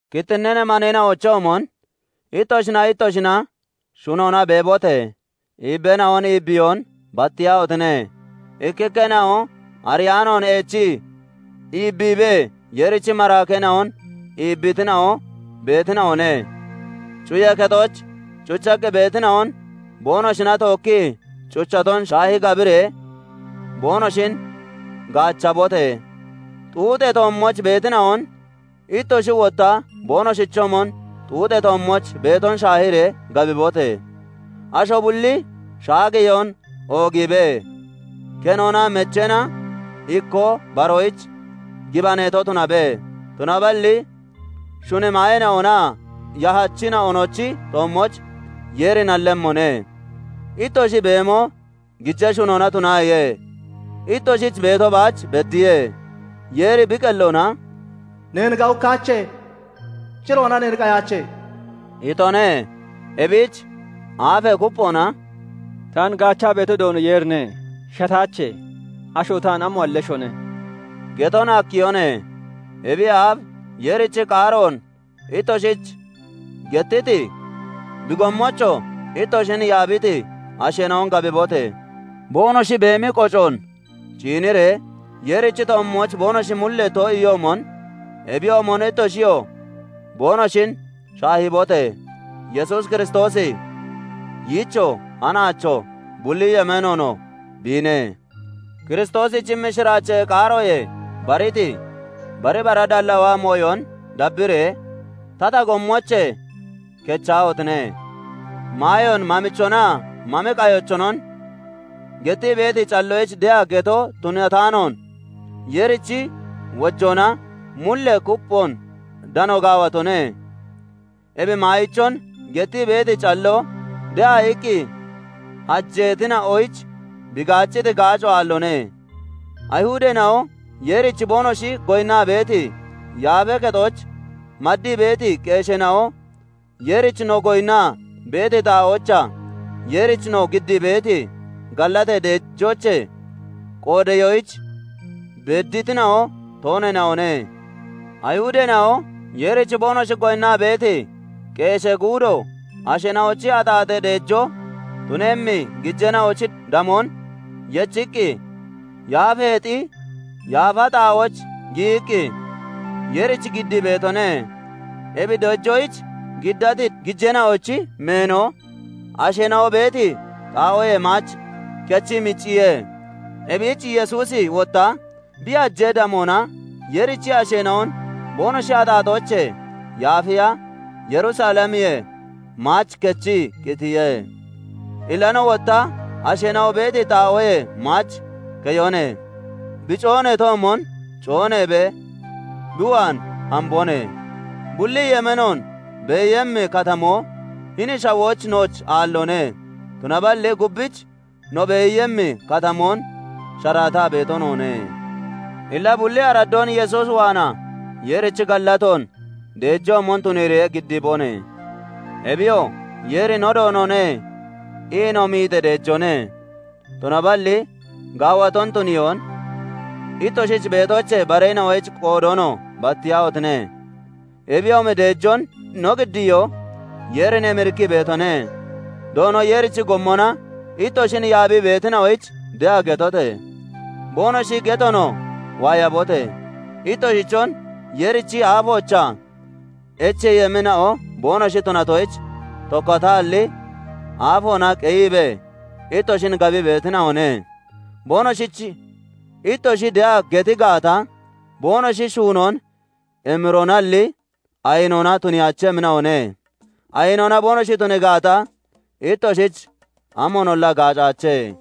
Kittinnee maneena'ochoomon ittoshinaa ittoshina shunoona beebote! Iibbeena'on iibbiyoon battiyaahotine! Ikkikkeena'o ariyaanoon eechii iibbiibee Yeerichi maraakeena'on iibbiitina'o beetina'one. Cuyee kexooch cuchaqqi beetina'on boonoshina tookkii cuchaton shaahi gabiree boonoshin gaachabote! Xuuxee toommooch beetina'on ittoshi wotta boonoshichoomon xuuxee toommooch beeton shaahiree gabibote! Asho bulli shaageyoon oogiibe; kenoonaa mecheena ikkoo baroyich gibaneeto tunabe; tunaballi shuni maayeena'onaa yahachina'onochi toommooch Yeeri nallemmone. Ittoshi beemo gijee shunona tunaaye; ittoshich beeto baach beddiye. Yeeri bi qelloona "Neen gawukkaache; ciroona neen qayaache" itone. Ebich aafee kupphoona "Taan gaachaa beeto Doono Yeerine; shataache; Asho taan amoon halleshone?" geton hakkiyone. Ebiyee aaf Yeerichi qaaroon ittoshich gettiti, bi gommoochoo ittoshin yaabiti asheena'on gabibote! Boonoshi beemi qocoon ciiniree, Yeerichi toommooch boonoshi mullee too'iyoomon, ebiyoomon ittoshiyoo boonoshin shaahibote! Yesuus Kiristoosi yiichoo, hanaachoo, bulli yemeenoonoo biine. Kiristoosichi mishiraachee qaaroyee bariti bari bara dallaawa mooyon dabbiree tata gommoochee kechaahotine! Maayoon mamichonaa mami qayichonon gettii beeti calloyich de'a geto tunataanoon, Yeerichi wojoona mullee kupphoon dano gaawatone. Ebi maayichon gettii beeti calloo de'a iqqi hajeetina'oyich bi gaacciti gaaco aalloone. Ayihudeena'o Yeerich boonoshi goyinnaa beeti yaafee kexooch maddii beeti qeesheena'o Yeerich no goyinnaa beeti xaa'oochaa Yeerich no giddii beeti gallatee deejoochee qoodeyoyich bedditina'o tooneena'one. Ayihudeena'o Yeerich boonoshi goyinnaa beeti qeeshee guudo asheena'ochi axaaxee deejoo tunemmi gijeena'ochi damoon yechiqqi, yaafeexi yaafa xaa'ooch giyiqqi, Yeerich giddii beetone; ebi deejoyich giddati gijeena'ochi meeno asheena'o beeti xaa'oyee maach kichee micciye. Ebich Yesuusi wotta bi hajee damoona Yeerichi asheena'on boonoshi axaaxoochee yaafiya Yerusalemiyee maach kichee qitiye. Illa no wotta asheena'o beeti xaa'oyee maach keyone. Bi cooneetoomon cooneebee bi waan hambone. Bulli yemeenoon beeyemmi katamoo hini shawooch nooch aalloone; tunaballi gubbich no beeyemmi katamoon sharaataa beeto noone. [Illa] bulli araddoon Yesuus waanaa Yeerich gallatoon deejoomon tuniiree giddiibone; ebiyoo "Yeeri no Doonone" ii no miixee deejoone. Tunaballi gaawaton tuniyoon, ittoshich beetoochee bareena'oyich qoodoonoo battiyaahotine! Ebiyoomi deejoon no giddiyoo Yeerin emirikkii beetone. Doono Yeerichi gommona ittoshin yaabii beetina'oyich de'a getote! Boonoshi getoonoo waayabote! Ittoshichon Yeerichi aafoochaa echeeyemmina'o boonoshi tunatoyich, tokkataalli aafoona qeyiibee ittoshin gabii beetina'one. Boonoshich ittoshi de'a geti gaata, boonoshi shuunoon emiroonalli ayinoona tuniyaachemmina'one. Ayinoona boonoshi tunii gaata, ittoshich amoonolla gaacaache.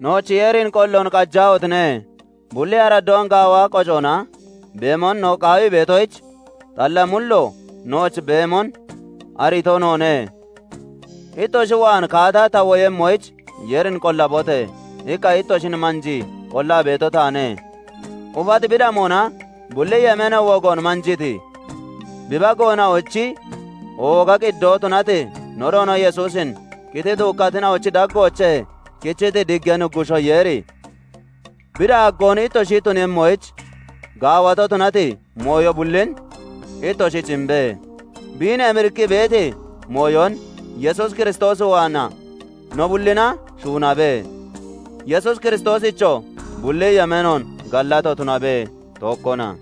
Nooch Yeerin qolloon qajaahotine! Bulli araddoon gaawa qocoona beemon no qaawii beetoyich, xalla mullo nooch beemon ariito noone. "Ittoshi waan kaata ta woyemmoyich, Yeerin qollabote!" iqqa ittoshin manjii qollaa beeto taane. Ufati bi damoona bulli yemeenee wogoon manjiiti, bi bageena'ochi ooga Qiddoo tunati no Doono Yesuusin qitii duukkatina'ochi daggoochee kichiti Diggee Nuggushoo Yeeri, bi daaggoon ittoshi tuniiyemmoyich, gaawato tunati mooyo bullin ittoshich imbe; biin emirikkii beeti mooyon Yesuus Kiristoos waanaa no bullina shuunabe. Yesuus Kiristoosichoo bulli yemeenoon gallato tunabe; tookkona.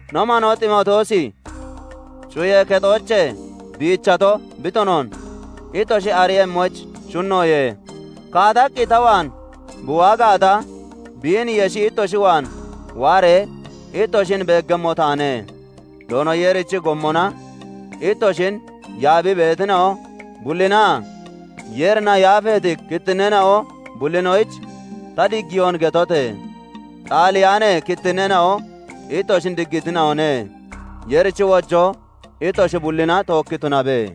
No manoo Ximootiyoosi cuyee kexoochee biichato bi tunoon ittoshi ariiyemmoyich shunnoye. Kaataqqi ta waan bi waa gaata, biin yeshi ittoshi waan waaree ittoshin beeggemmo taane. Doono Yeerichi gommona ittoshin yaabii beetina'o bullinaa Yeerina yaafeeti kittinneena'o bullinoyich ta diggiyoon getote! Xaaliyaanee kittinneena'o ittoshin diggiitina'one. Yeerichi wojoo ittoshi bullina tookki tunabe.